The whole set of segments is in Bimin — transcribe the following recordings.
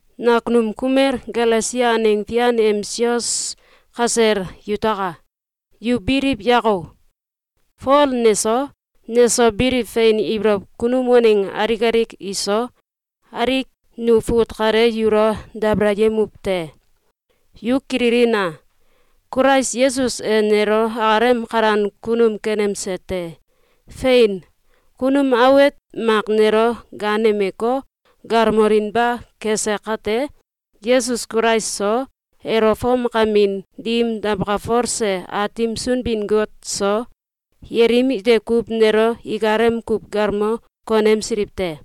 Nakunum kumel Galesia aneng fian em sios kasel yutaka! Yu biliw yako! Fol neso, neso biliw fein ibolow kunum waneng alik alik iso, alik nu fut kale yulo dabalayemuw te. Yu kililina! Kulais Yesus e nelo akalem kalan kunum kenemse te. Fein! Kunum awet mak nelo gaanemeko, galmolinba kese kate, Yesus Kulais so, elo fomkamin dim dawkalfose Aatim Sunbin-Got so, yelim ite kuw nelo ikalem kuw galmo konemsiliw te.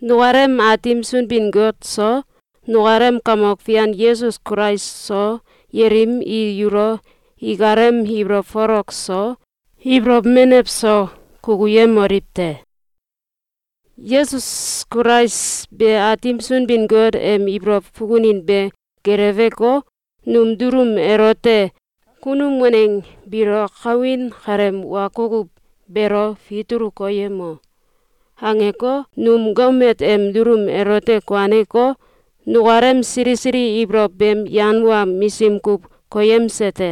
Nukalem Aatim Sunbin-Got so nukalem Kamok Fian Yesus Kulais so yelim i yulo ikalem ibolow folok so, ibolow menew so, kukuyemoliw te! Yesus Kulais be Aatim Sunbin-Got em ibolow fukunin be geleweko, num dulum elote “Kunum waneng biilo kawin kaleem wa kukuw beelo fitulu koyemo!”, angeko, num gomet em dulum elote kuaneko, nukalem sili sili ibolow beem yan wa misim kuw koyemse te.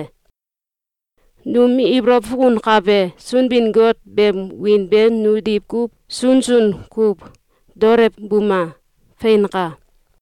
Num ibolow fukunkabe Sunbin-Got beem wiin be nu diwkuw sunsun kuw daolewbuma! Feinka.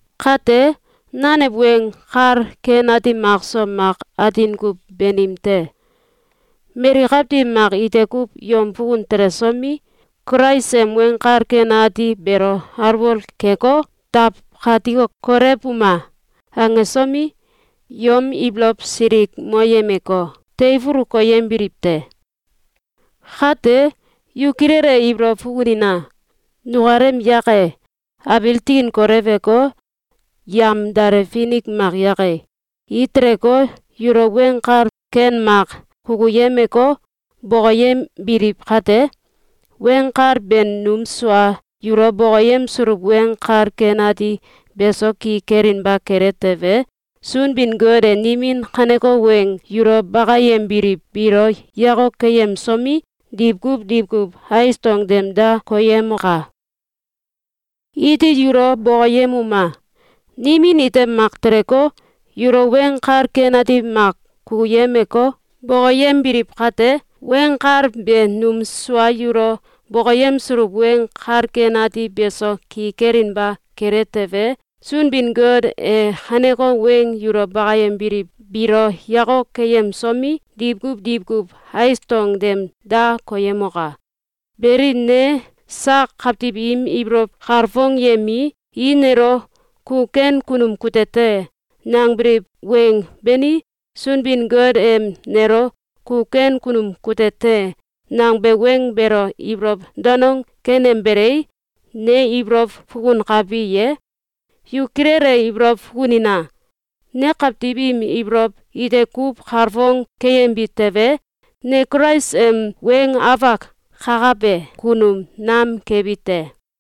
Kate, nanew weng kal ken ati makso mak atin kuw banim te. Mali kawtiw mak ite kuw yom fukun telesomi, “Kulais em Weng Kal Ken Ati beelo alwol keko, dawkatiko, kolewbuma!”, angesomi, yom ibolow silikmoyemeko, teifulu koyembiliw te. Kate, yu kilele ibolow fukunina! Nukalem yake, abiil tikin kolewko, yamdale finik mak yake, i teleko, yulo weng kal ken mak kukuyemeko, bokoyembiliw kate, weng kal be num sua yulo bokoyemsuluw Weng Kal Ken Ati beso ki kelinba kele tewe, Sunbin-Got e nimin kaneko weng yulo bakayembiliw biilo yakok keyemsomi, diwkuw diwkuw ais dong tem da koyemoka! Iti yulo bokoyemuma! Nimin ite mak teleko, yulo weng kal ken mak kukuyemeko, bokoyembiliw kate, weng kal be num sua yulo bokoyemsuluw Weng Kal Ken Ati beso ki kelinba kele tewe, Sunbin-Got e kaneko weng yulo bakayembiliw biilo yakok keyemsomi, diwkuw diwkuw ais dong tem da koyemoka! Beli, ne sak kawtiw im ibolow kalfongyemii, i nelo “Ku ken kunum kute te!”, nangbiliw weng bani, Sunbin-Got em nelo “Ku ken kunum kute te!”, nangbe weng beelo ibolow danong kenembelei, ne ibolow fukunakbi ye? Yu kilele ibolow fukunina! Ne kawtiw im ibolow ite kuw kalfong keyembi tewe, ne Kulais em weng afak kakabe kunum nam kebi te.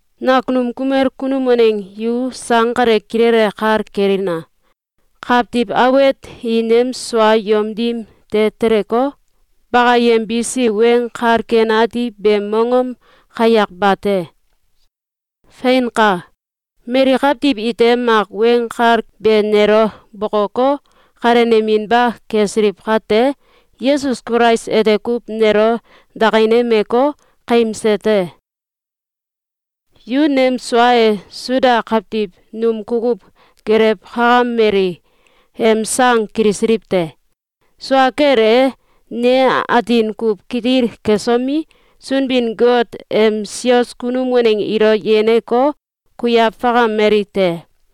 Nakunum kumel kunum waneng yu sang kale kilele kal kelina! Kawtiw awet i nem sua yom dim de teleko, bakayembisi Weng Kal Ken Ati beem mongom kayak bate. Feinka! Mali kawtiw ite mak Weng Kal be nelo bokoko, kaleneminba kesiliw kate, Yesus Kulais ete kuw nelo dakinemeko, kaimse te. Yu nem sua e Suda kawtiw num kukuw gelewkakameli em sang kilisiliw te. Sua kel e, ne atin kuw kitil kesomi, Sunbin-Got em sios kunum waneng ilo yeneko, kuiaw fakameli te.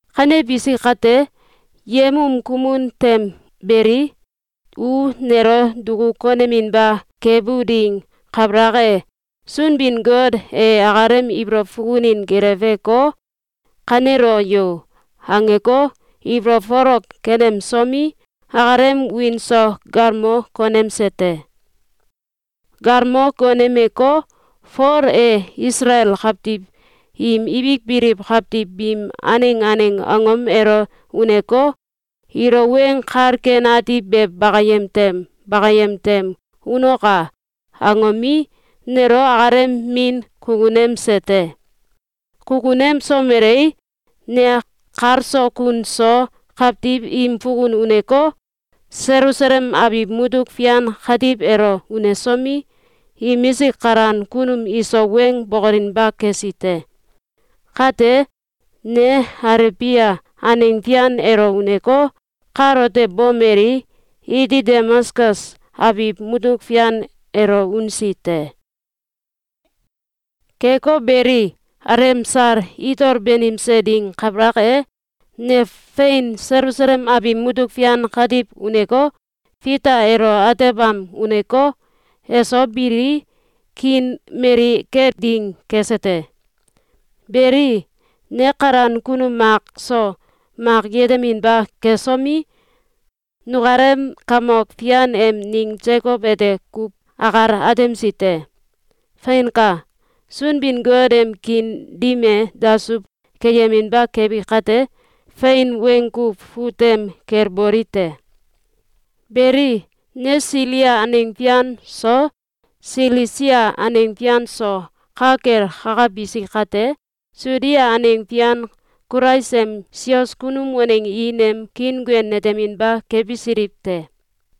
Kanebisi kate, yem um kumun tem belii, u nelo duku koneminba kebu ding kabalak e, Sunbin-Got e akalem ibolow fukunin geleweko, “Kanelo yo!”, angeko, ibolow folok kenemsomi, akalem wiin so galmo konemse te. Galmo konemeko, “Fol e Isalael kawtiw im ibik biliw kawtiw biim aneng aneng angom elo uneko, ilo Weng Kal Ken Ati be bakayem tem bakayem tem unoka!”, angomi, nelo akalem Min kukunemse te. Kukunemsomelei, ne kal so kun so kawtiw im fukun uneko, Selusalem abiw mutuk fian katiw elo unesomi, imisik kalan kunum iso weng bokolinba kesi te. Kate, ne Alebia aneng fian elo uneko, kalote bomelii, iti Damaskus abiw mutuk fian elo unsi te. Keko beli, alemsal itol banimse ding kabalak e, ne fein Selusalem abiw mutuk fian katiw uneko, Fita elo atebam uneko, eso bilii, kiin mali kel ding kese te. Beli, ne kalan kunum mak so mak yeteminba kesomi, nukalem Kamok Fian em ning Sekow ete kuw akal atemsi te. Feinka! Sunbin-Got em kiin dim e dasuw keyeminba kebi kate, fein weng kuw fut tem kel boli te. Beli, ne Silia aneng fian so Silisia aneng fian so ka kel kakabisi kate, Sudia aneng fian Kulais em sios kunum waneng i nem kiinguen neteminba kebisiliw te.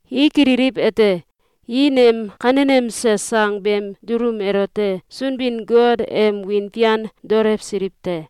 I kililiw ete, i nem kanenemse sang beem dulum elote Sunbin-Got em wiin fian daolewsiliw te.